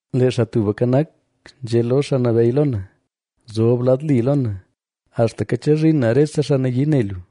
Lee Xaa Tubka Nak, nzhé lo Xaa Nabeyy lo na: “Zob lad li lo na, axtaka chezhin na rese xaa nayii ne lu,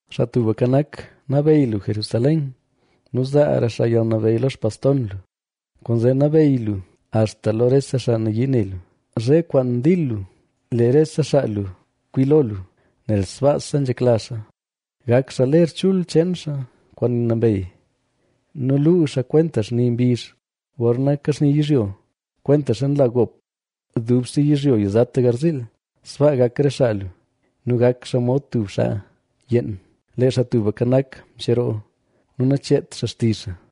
Xaa Tubka Nak, xaal nabeyy lu Jerusalén nu zaara xaa yalnabeyy lo xpaston lu, ¡Kwaanzee nabeyy lu axta lo rese xaa nayii ne lu! Zhe kwaan dil lu, lee rese xaa lu kwi lo lu, nel sbaasa nzhekla xaa. Gak xaa ler chul cheen xaa kwaan nambey nu luu xaa kwenta xni mbizh gorna kaxni yizhyo. Kwentaxa nla gop dubse yizhyo yizata garziil, sbaa gak re xaa lu, nu gak xaa mod tub xaa yeen. Lee Xaa Tubka Nak mcheroo nu nacheet xaa xtizh xaa: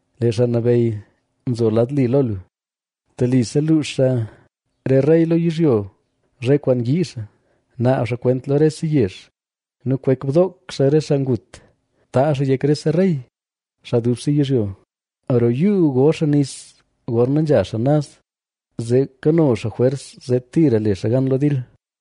Lee Xaa Nabeyy nzo lad li lo lu; telise luux xaa re rey lo yizhyo zhe kwaan yii xaa. Naab xaa kwent lo rese yezh; nu kwek bdook xaa re xaa ngut; taazh xaa yek rese rey, xaa dubse yizhyo. Roo yuu go xaa nis gorna nzha xaa naz, zee kano xaa jwers zee tira le xaa gan lo dil.